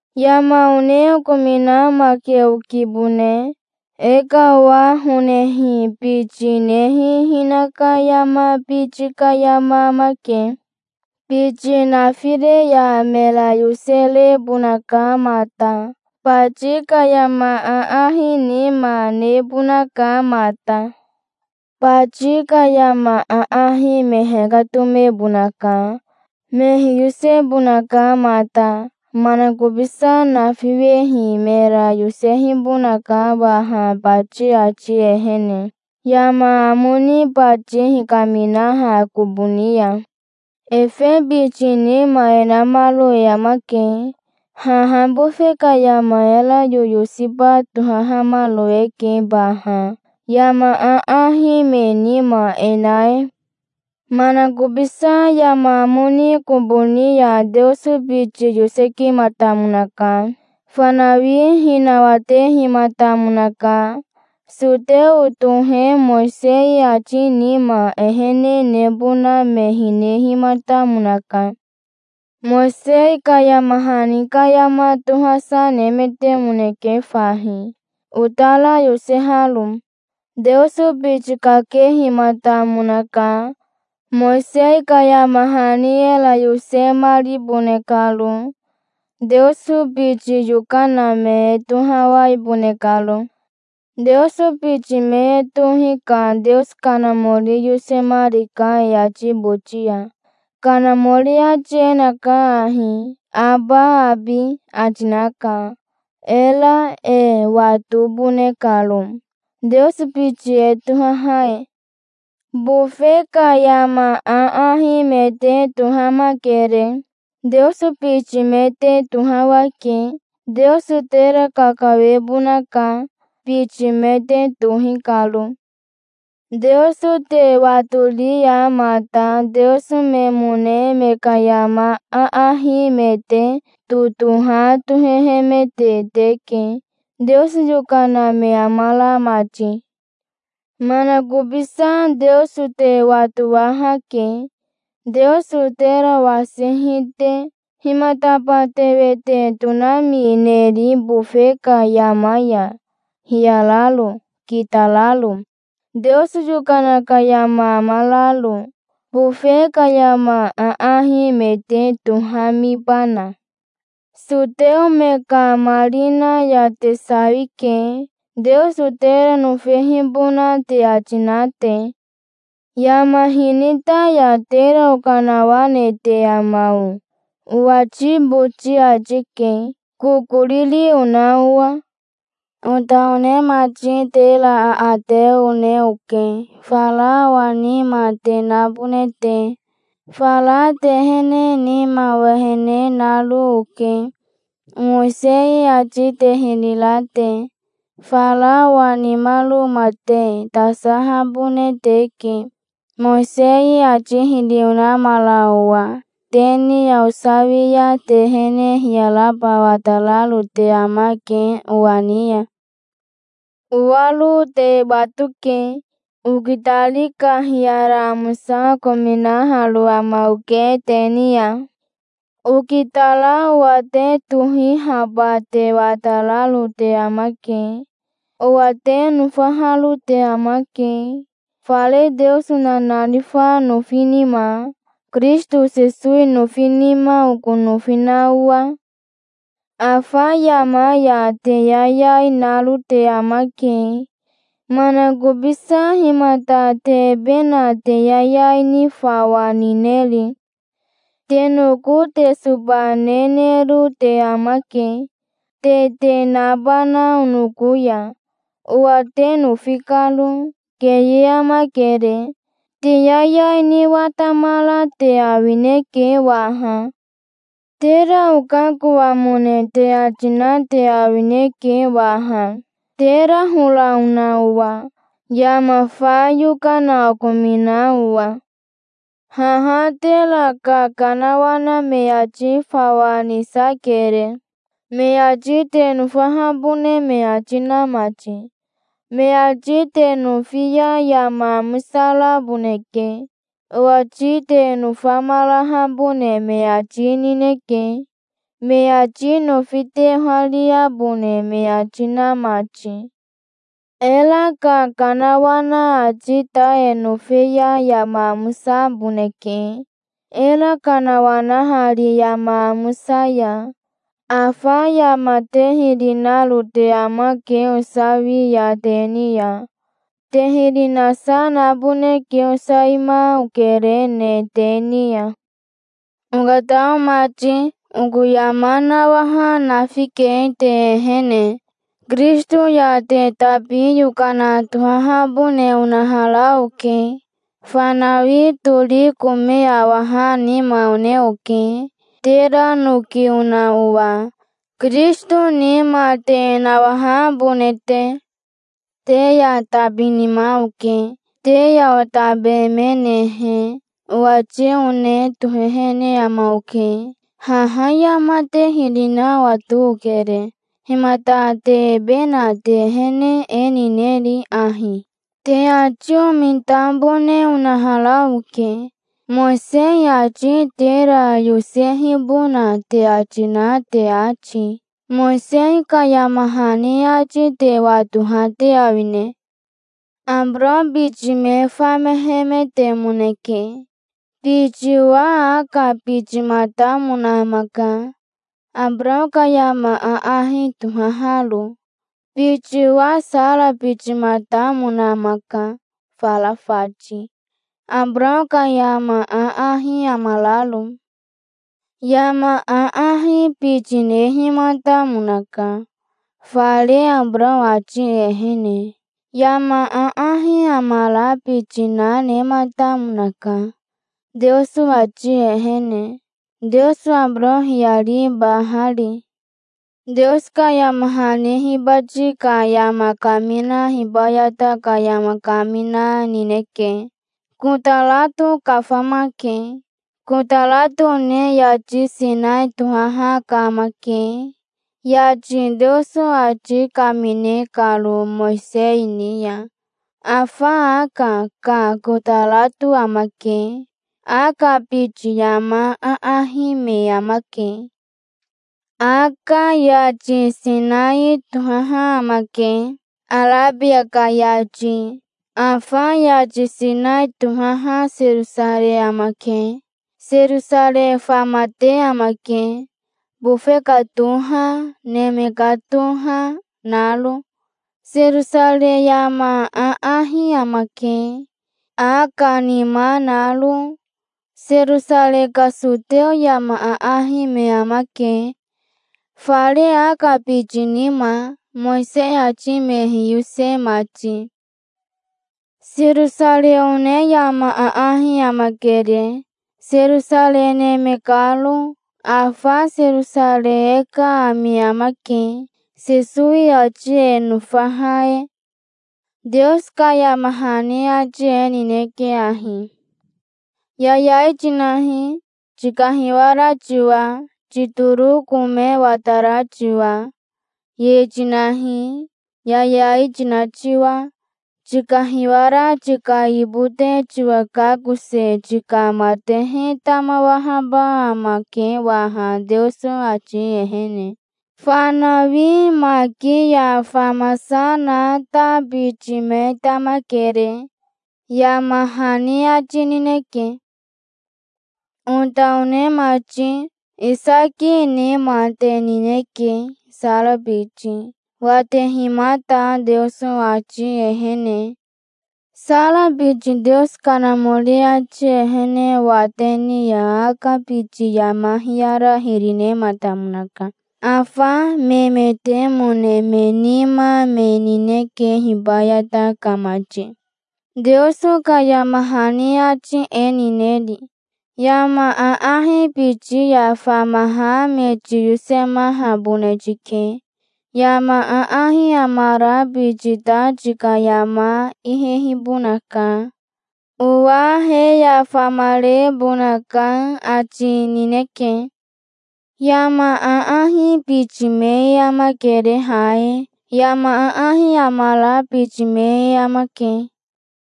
Yama one okominamake okibone. E ka owa honehi biti nehi hinaka yama biti ka yama amake. Biti nafire ya mera yoserebonaka mata. Bati ka yama aahi nima nebonaka mata. Bati ka yama aahi me hekatomebonaka. Me hiyosebonaka mata. Manakobisa nafiwehi mera yosewehibonaka waha bati ati ehene, yama amo ni bati hikaminaha kobo ni ya. Efe biti nima e namaro e amake. Haha bofe ka yama era yoyosiba tohahamaro eke baha, yama aahi me nima e na e. Manakobisa yama amo ni kobo ni ya Teoso biti yosekimatamonaka. Fanawi hinawatehimatamonaka. Soteo tohe Mowisei ati nima ehene nebona me hinehimatamonaka. Mowisei ka yama hani ka yama tohasa nemetemoneke fahi, otara yoseharo. Teoso biti kakehimatamonaka, Mowisei ka yama hani era yosemaribone karo, Teoso biti yokana me e tohawaibone karo. Teoso biti me e tohi ka Teoso Kanamori yosehimarika e ati boti ya. Kanamori ati e naka ahi: "Aba, abi", ati naka, era e watobone karo, Teoso biti e tohaha e. Bofe ka yama aahi me te tohamakere. Teoso biti me te tohawake. Teoso tera kakawebonaka, biti me te tohi karo. Teoso te watori ya mata teoso memone me ka yama aahi me te totoha tohehemete teke, Teoso yokana me amara mati. Manakobisa Teoso te watowahake, Teoso tera wasihi te. Himataba te wete tonamineri bofe ka yama ya, hiyararo, kitararo, Teoso yokana ka yama amararo? Bofe ka yama aahi me te tohamibana? Soteo me ka marina ya te sawike, Teoso tera nofehibona te ati na te. "Yama hinita ya tera okanawanete ama o?" owati boti ati ke, kokoriri ona owa. Ota one mati, tera aate one oke, fara owa nima te nabone te. Fara te ehene nima owehene naro oke, Mowisei ati te hiri ra te. Fara owa nimaroma te tasahabone teke, Mowisei ati hiri onamara owa. Te ni ya osawi ya te ehene hiyaraba watararo te amake owa ni ya. Owaro te watoke. Okitari ka hiyara amosa okominaharo ama oke te ni ya. Okitara owa te tohihaba te watararo te amake. Owa te nofaharo te amake, fare Teoso nanarifa nofi nima, Kirisito Sesowi nofi nima oko nofi na owa. Afa yama ya te yayai naro te amake. Manakobisa himata te ebe na te yayai ni fawa nineri? Te noko te soba nenero te amake, te te nabana onoko ya, owa te nofi karo. Keye amakere. Te yayai ni watamara te awineke waha. Tera okakoamone te ati na te awineke waha, tera hora ona owa, yama fa yokana okomina owa. Haha tera kakanawana me ati fawa nisakere, me ati te nofahabone me ati na mati. Me ati te nofi ya yama amosaraboneke. Owati te nofamarahabone me ati nineke, me ati nofi te ohariabone me ati na mati. Era kakanawana ati ta e nofe ya yama amosaboneke, era kanawanahari yama amosa ya. Afa yama te hiri naro te amake osawi ya te ni ya. Te hiri nasa naboneke osawima okerene te ni ya. Okatao mati, oko yama nawaha nafike te ehene. Kirisito ya te tabi yokana tohahabone onahara oke. Fanawi tori kome awaha nima one oke, tera noki ona owa, Kirisito nima te nawahabone te. Te ya tabi nima oke. Te ya otabemenehe, owati one tohehene ama oke. Haha yama te hiri na owato okere. Himata te ebe na te ehene e nineri ahi? Te ati omitabone onahara oke, Mowisei ati tera yosehibona te ati na te ati. Mowisei ka yama hani ati te watoha te awine? Abarao biti me famehemetemoneke. Biti owa Aka bitimatamona amaka, Abarao ka yama aahi tohaharo. Biti owa Sara bitimatamona amaka, fara fati, Abarao ka yama aahi amararo. Yama aahi biti nehimatamonaka, fare Abarao ati ehene. Yama aahi amara biti na nematamonaka, Teoso ati ehene, Teoso Abarao hiyaribahari. Teoso ka yama hani hibati ka yama kamina hibayata ka yama kamina nineke. Kotarato kafamake. Kotarato one yati Sinai tohaha ka amake, yati Teoso ati kamine karo Mowisei ni ya. Afa Aka ka kotarato amake. Aka biti yama aahi me amake. Aka yati Sinai tohaha amake, Arabia ka yati. Afa yati Sinai tohaha Serosarei amake. Serosarei famate amake, bofe ka toha, neme ka toha, naro. Serosarei yama aahi amake, Aka nima naro. Serosarei ka soteo yama aahi me amake, fare Aka biti nima, Mowisei ati me hiyose mati. Serosarei one yama aahi amakere, Serosarei neme karo. Afa Serosarei e ka ami amake, Sesowi ati e nofaha e. Teoso ka yama hani ati e nineke ahi: "Yayai tinahi, tikahiwara tiwa, titoro kome watara tiwa. Ye tinahi, yayai tina tiwa. Tikahiwara tika yibote tiwa kakose tika matehe tamawahaba amake waha Teoso ati ehene. Fanawi maki ya famasa na ta biti me tamakere", yama hani ati nineke. Ota one mati, Isaki nima te nineke, Sara biti, watehimata Teoso ati ehene. Sara biti Teoso Kanamori ati ehene wate ni ya Aka biti yama hiyara hiri nematamonaka. Afa memetemone me nima me nineke hibayata ka mati. Teoso ka yama hani ati e nineri? "Yama aahi biti ya famaha me tiyosemahabone tike. Yama aahi amara biti ta tika yama ihehibonaka. Owa he ya famarebonaka", ati nineke. Yama aahi biti me e amakere ha e. Yama aahi amara biti me e amake.